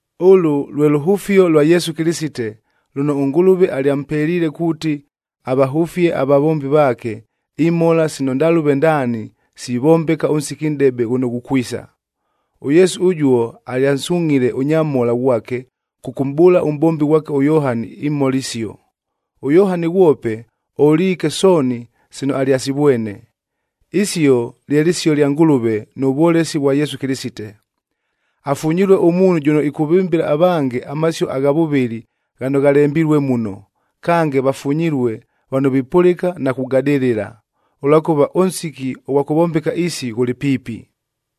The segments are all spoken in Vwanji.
Ʉlʉ lwe lʉhʉfio lwa Yesu Kɨlɨsite, lʉno ʉNgʉlʉve alyampeliile kuuti avahʉfie avavombi vaake, imhola sino ndalʉve ndaani sivombeka ʉnsiki nʼdebe ghʉno ghukwisa. ɄYesu ʉjuo alyansungʼhile ʉnyamhola ghwake kʉkʉmʼbʉʉla ʉmʼbombi ghwake ʉYohani imhola isio. ɄYohani ghwope oliike sooni sino alyasivwene. Isio lye lɨsio lya Ngʉlʉve nʉ vwolesi vwa Yesu Kɨlɨsite. Afunyilue ʉmuunhu jʉno ɨkʉvɨmbɨla avange amasio agha vʉvɨli ghano ghalembilue muno, kange vafunyilue vano vipʉlɨka na kugadɨlɨla, ʉlwakʉva ʉnsiki ʉghwa kʉvombeka isi ghʉlɨ piipi.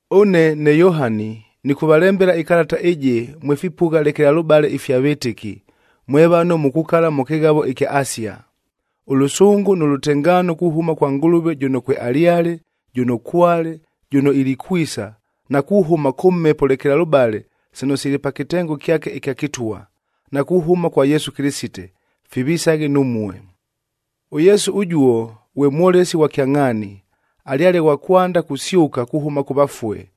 Ʉne ne Yohani, nɨkʉvalembela ɨkalata ɨjɨ mwe fipʉgha lekelalʉbale ifya vɨtɨki, mwe vano mukukala mʉ kɨghavoa ɨkya Asia. Ʉlʉsʉngʉ nʉ lʉtengaano kuhʉma kwa Ngʉlʉve jʉno kwealyale, jʉno kwale, jʉno ilikwisa na kuhʉma kʉ Mhepo lekelalʉbaleb sino sili pa kɨtengo kyake ɨkya kɨtwa, na kuhʉma kwa Yesu Kɨlɨsite, fivisaghe numue. ɄYesu ʉjuo ghwe mwolesi ghwa kyangʼhaani, alyale ghwa kwanda kusyʉka kuhʉma kʉ vafue,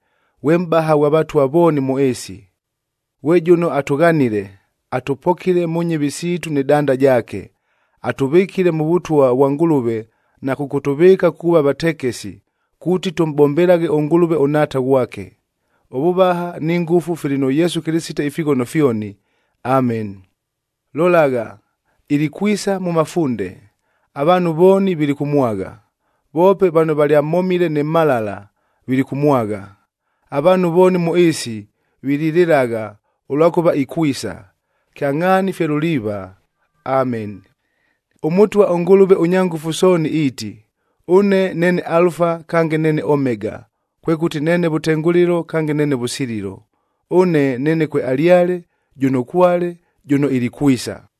ghwe mʼbaha ghwa vatwa vooni mʉ ɨɨsi. Ghwe jʉno atʉghanile, atʉpokile mʉ nyɨvi siitu nɨ danda jaake. Atʉvɨkile mʉ Vʉtwa vwa Ngʉlʉve na kʉkʉtʉvɨɨka kuuva vatekesi, kuuti tʉmʼbombelaghe ʉNgʉlʉve ʉNhaata ghwake. Ʉvʉvaha ni ngʉfu fili nʉ Yesu Kɨlɨsite ifighono fyoni! Ameni! Lolagha, ilikwisa mʉ mafunde! Avaanhu vooni vilikʉmwagha, voope vano valyamhomile nɨ mhalala, vilikʉmwagha. Avaanhu vooni mʉ ɨɨsi vililɨlagha, ʉlwakʉva ikwisa. Kyangʼhaani fye luliiva. Ameni! ɄMʉtwa ʉNgʉlʉve ʉNyangʉfu Sooni iiti, “Ʉne neene Alufa kange neene Omega, kwekʉti neene vʉtengʉlɨlo kange neene vʉsililo. Ʉne neene kwealyale, jʉno kwale, jʉno ilikwisa.”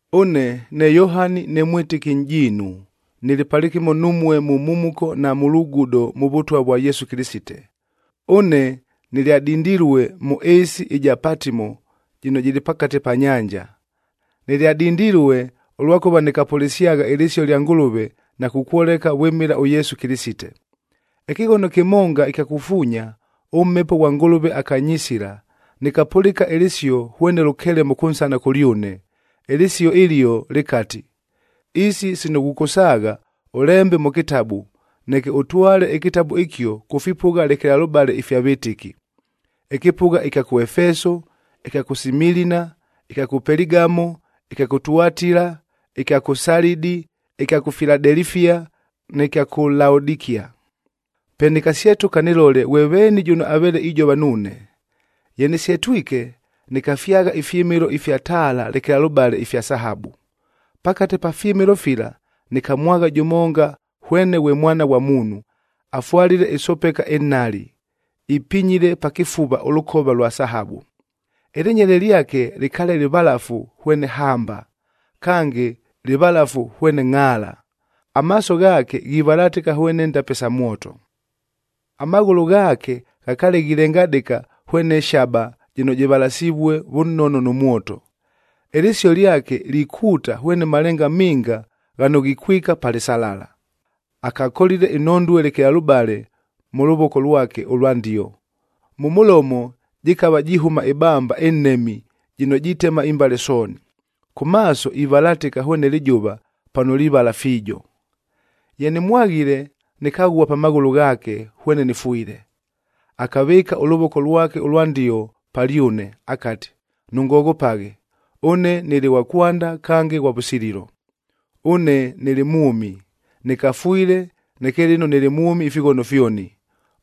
Ʉne ne Yohani ne mwɨtɨki nʼjiinu, nɨlɨ palɨkɨmo numue mʉ mhumuko na mʉ lugudo mʉ Vʉtwa vwa Yesu Kɨlɨsite. Ʉne nɨlyadindilue mʉ ɨɨsi ɨja Patimo jɨno jɨlɨ pakate pa nyanja. Nɨlyadindilue ʉlwakʉva nɨkapʉlɨsyagha ɨlɨsio lya Ngʉlʉve na kukwoleka vwɨmɨla ʉYesu Kɨlɨsite. Ɨkɨghono kɨmonga ɨkya kufuunya, ʉMhepo ghwa Ngʉlʉve akanyisila, nɨkapʉlɨka ɨlɨsio hwene lʉkelemo kʉnsana kʉlyʉne. Ɨlɨsio ɨlio lɨkati, “Isi sino ghʉkʉsaagha ʉlembe mʉ kɨtabu, neke ʉtwale ɨkɨtabu ɨkio kʉ fipʉgha lekelalʉbale ifya vɨtɨki: ɨkɨpʉgha ɨkya kʉ Efeso, ɨkya kʉ Similina, ɨkya kʉ Peligamo, ɨkya kʉ Tuatila, ɨkya kʉ Salidi, ɨkya kʉ Filadelifia, nɨ kya kʉ Laodikia.” Pe nɨkasyetʉka nɨlole ghwe veeni jʉno aveele ijova nuune. Ye nɨsyetwike, nɨkafyagha ifyɨmɨlo ifya taala lekelalʉbale ifya sahabu. Pakate pa fyɨmɨlo fila nɨkamwagha jʉmonga hwene ghwe Mwana ghwa Muunhu,c afwalile ɨsopeka ɨnhali, ipinyile pa kɨfuva ʉlʉkova lwa sahabu. Ɨlɨnyele lyake lɨkaale lɨvalafu hwene hamba, kange lɨvalafu hwene ngʼhaala. Amaaso ghaake ghivalatɨka hwene ndape sa mwoto. Amaghʉlʉ ghaake ghakaale ghilengadɨka hwene shaba jɨno jɨvalasivue vʉnono nʉ mwoto. Ɨlɨsio lyake likuuta hwene malenga minga ghano ghikwika pa lɨsalala. Akakolile inhondue lekelalʉbale mʉ lʉvoko lwake ʉlwa ndio, mʉ mʉlomo jɨkava jihʉma ɨbamba ɨnhemi jɨno jitema imbale sooni. Kʉ maaso ivalatɨka hwene lɨjʉva pano livala fiijo. Ye nɨmwaghile, nɨkaghua pa maghʉlʉ ghaake hwene nɨfwile. Akavɨɨka ʉlʉvoko lwake ʉlwa ndio palyʉne akati, “Nʉngoghopaghe! Ʉne nɨlɨ ghwa kwanda kange ghwa vʉsililo. Ʉne nɨlɨ mwʉmi! Nɨkafwile, neke lɨno nɨlɨ mwʉmi ifighono fyoni.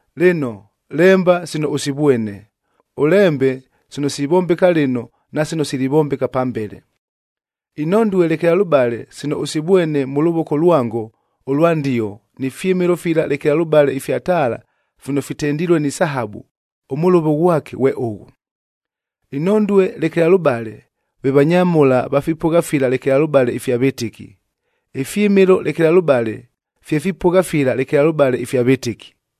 “Lɨno, lemba sino ʉsivwene, ʉlembe sino sivombeka lɨno na sino silivombeka pambele. Inhondue lekelalʉbale sino ʉsivwene mʉ lʉvoko lwango ʉlwa ndio, ni fyɨmɨlo fila lekelalʉbale ifya taala fino fitendilue ni sahabu, ʉmʉlʉvo ghwake ghwe ʉghʉ: Inhondue lekelalʉbale, ve vanyamhola va fipʉgha fila lekelalʉbale ifya vɨtɨki; ifyɨmɨlo lekelalʉbale, fye fipʉgha fila lekelalʉbale ifya vɨtɨki.